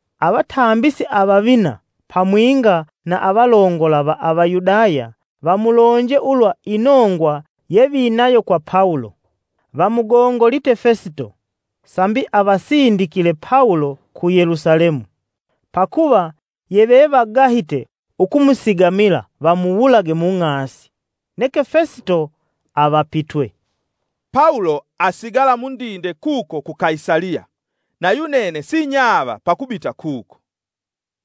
Avatambisi avavina pamwinga na avalongola va Avayudaya vamulonje ulwa inongwa yevinayo kwa Pawulo. Vamugongolite Fesito, sambi avasindikile Pawulo ku Yelusalemu; pakuva yevevagahite ukumusigamila vamuwulage mung'asi. Neke Fesito avapitwe, “Pawulo asigala mundinde kuko ku Kaisaliya na yunene sinyava pakubita kuko.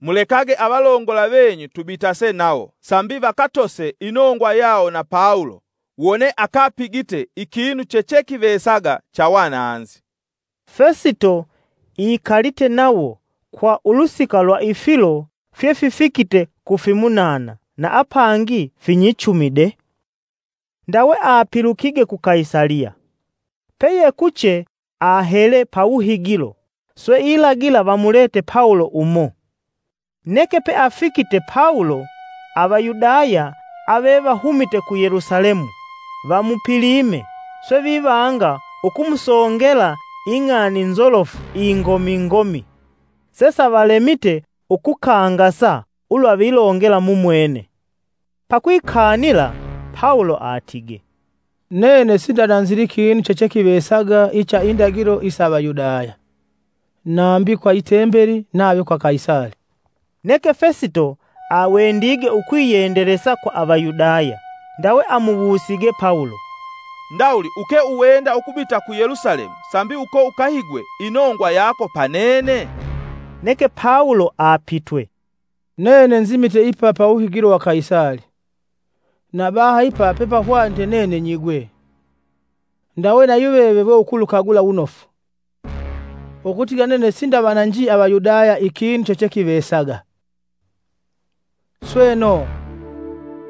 Mulekage avalongola venyu tubitase nawo sambi vakatose inongwa yawo na Pawulo wone akapigite ikinu chechekivesaga cha wananzi.” Fesito ikalite nawo kwa ulusika lwa ifilo fyefifikite kufimunana na apangi finyichumi de, ndawe apilukige ku Kaisaliya. Peyekuche ahele pawuhigilo, swe ilagila vamulete Pawulo umo. Neke peafikite Pawulo, Avayudaya avevahumite ku Yelusalemu vamupilime swe vivanga ukumusongela ing'ani nzolofu ingomingomi sesavalemite ukukangasa ulwa vilongela mumwene. Pakwikanila, Pawulo atige, “Nene sindananzili kinu chechekivesaga icha indagilo isa Avayudaya, nambi kwa Itembeli, nave kwa Kaisali.” Neke Fesito awendige ukwiyendelesa kwa Avayudaya ndawe amuwusige Pawulo, “Ndawuli uke uwenda ukubita ku Yelusalemu sambi uko ukahigwe inongwa yako pa nene?” Neke Pawulo apitwe, “Nene nzimite ipa pawuhigilo wa Kaisali, na baha ipa pepahwanite nene nyigwe. Ndawe na yuveve we ukulukagula wunofu, ukutigila nene sindavananji Avayudaya ikinu chechekivesaga. Sweno,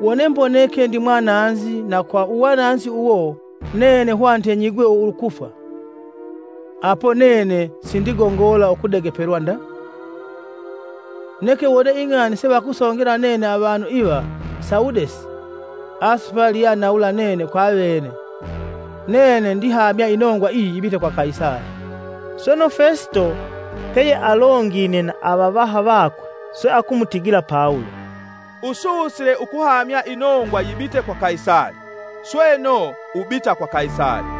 wone mboneke ndimwananzi na kwa uwananzi uwo nene hwanite nyigwe ukufwa apo nene sindigongola ukudegepelwa nda. Neke wone ing'ani sevakusongela nene avanu iva sawudesi, asupali yeanawula nene kwavene. Nene ndihamya inongwa iyi yibite kwa Kaisali!” Sweno, Fesito peyealongine na avavaha vakwe swe akumutigila Pawulo, “Ususile ukuhamya inongwa yibite kwa Kaisali, sweno, ubita kwa Kaisali.”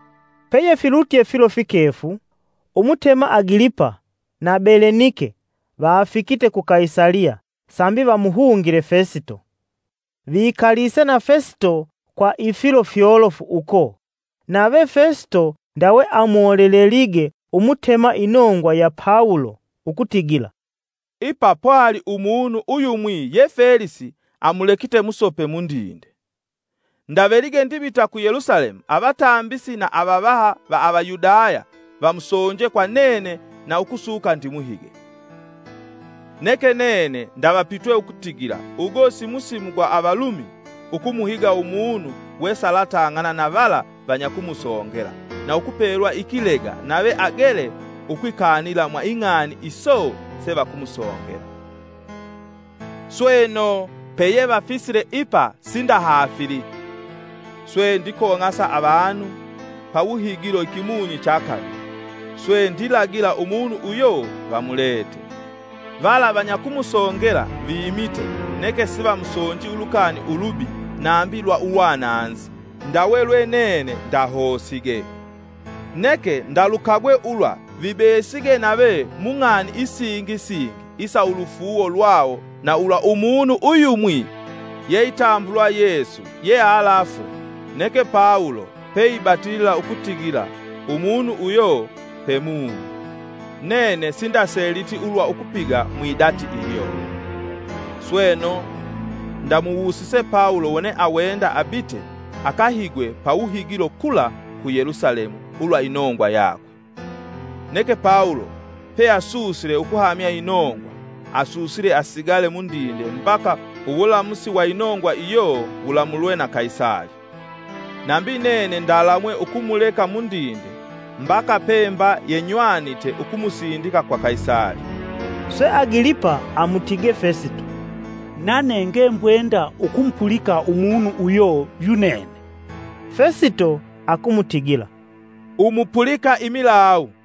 Peyefilutye filo fikefu, Umutema Agilipa na Belenike vafikite ku Kaisaliya sambi vamuhungile Fesito. Vikalise na Fesito kwa ifilo fyolofu uko nave Fesito ndawe amolelelige Umutema inongwa ya Pawulo ukutigila, “Ipa pwali umunu uyumwi ye Felisi amulekite musope mundinde. Ndavelige ndibita ku Yelusalemu avatambisi na avavaha va Avayudaya vamusonje kwa nene na ukusuka ndimuhige. Neke nene ndavapitwe ukutigila ugo simusimu gwa Avalumi ukumuhiga umunu we salatang'ana na vala vanyakumusongela na ukupelwa ikilega nave agele ukwikanila mwa ing'ani iso sevakumusongela. Sweno, peyevafisile ipa sindahaafili, swe ndikong'asa avanu pawuhigilo ikimunyi cha kavili, swe ndilagila umunu uyo vamulete. Vala vanyakumusongela vimite neke sivamusonji ulukani ulubi nambi lwa uwananzi ndawe lwe nene ndihosige. Neke ndalukagwe ulwa vibesige nave mung'ani isingi singi isa ulufuuwo lwawo na ulwa umunu uyumwi yeitambulwa Yesu yealafwe, neke Pawulo peibatilila ukutigila umunu uyo pemumi. Nene sindaseliti ulwa ukupiga mwidati ilyo. Sweno, ndamuwusise Pawulo wone awenda abite akahigwe pawuhigilo kula ku Yelusalemu ulwa inongwa yakwe. Neke Pawulo peasusile ukuhamya inongwa, asuusile asigale mundinde mbaka uwulamusi wa inongwa iyo wulamulwe na Kaisali. Nambi nene ndalamwe ukumuleka mundinde mbaka pemba yenywanite umusindika kwa Kaisali.” Swe Agilipa amutige Fesito, “Nane ngembwenda ukumupulika umunu uyo yunene.” Fesito akumutigila, “Umupulika imilawu.”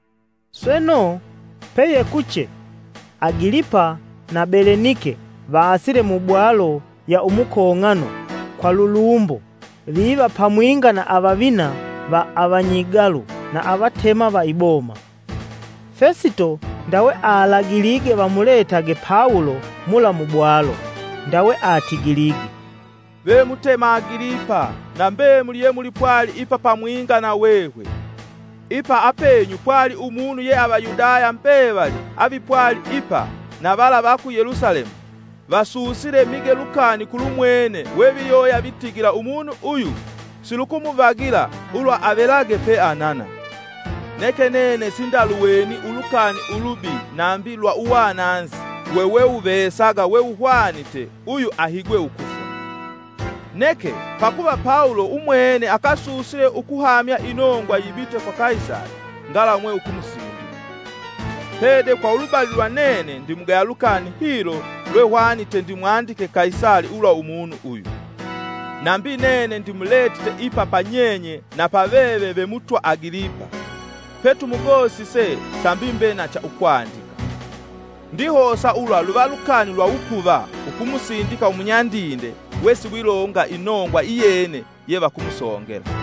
Sweno, peyekuche, Agilipa na Belenike vasile mu bwalo ya umukong'ano kwa lulumbo viva pamwinga na avavina va avanyigalu na avatema va iboma. Fesito ndawe alagilige vamuletage Pawulo mula mubwalo, ndawe atigilige, “Ve Mutema Agilipa na mbemuli yemwipwali ipa pamwinga na hwehwe! Ipa apenyu pwali umunu ye Avayudaya mbevali avipwali ipa na vala va ku Yelusalemu vasuusile mige lukani kulumwene we viyova vitigila umunu uyu silukuvagila ulwa avelage peanana. Neke nene sindaluweni ulukani ulubi nambi lwa uwananzi weweuvesaga wewuhwanite uyu ahigwe ukufwa. Neke, pakuva Pawulo umwene akasusile ukuhamya inongwa yibite kwa Kaisali, ngalamwe ukumusindika. Pede kwa ulubali lwa nene ndimugaya lukani hilo lwehwanite ndimwandikile Kaisali ulwa umunu uyu. Nambi nene ndimulesile ipa panyenye na pa veve ve Mutwa Agilipa, petumugosise, sambi ndive na cha ukwandika. Ndihosa ulwa luva lukani lwa wupuva ukumusindika umunyandinde wesiwilonga inongwa iyene yevakumusongela.”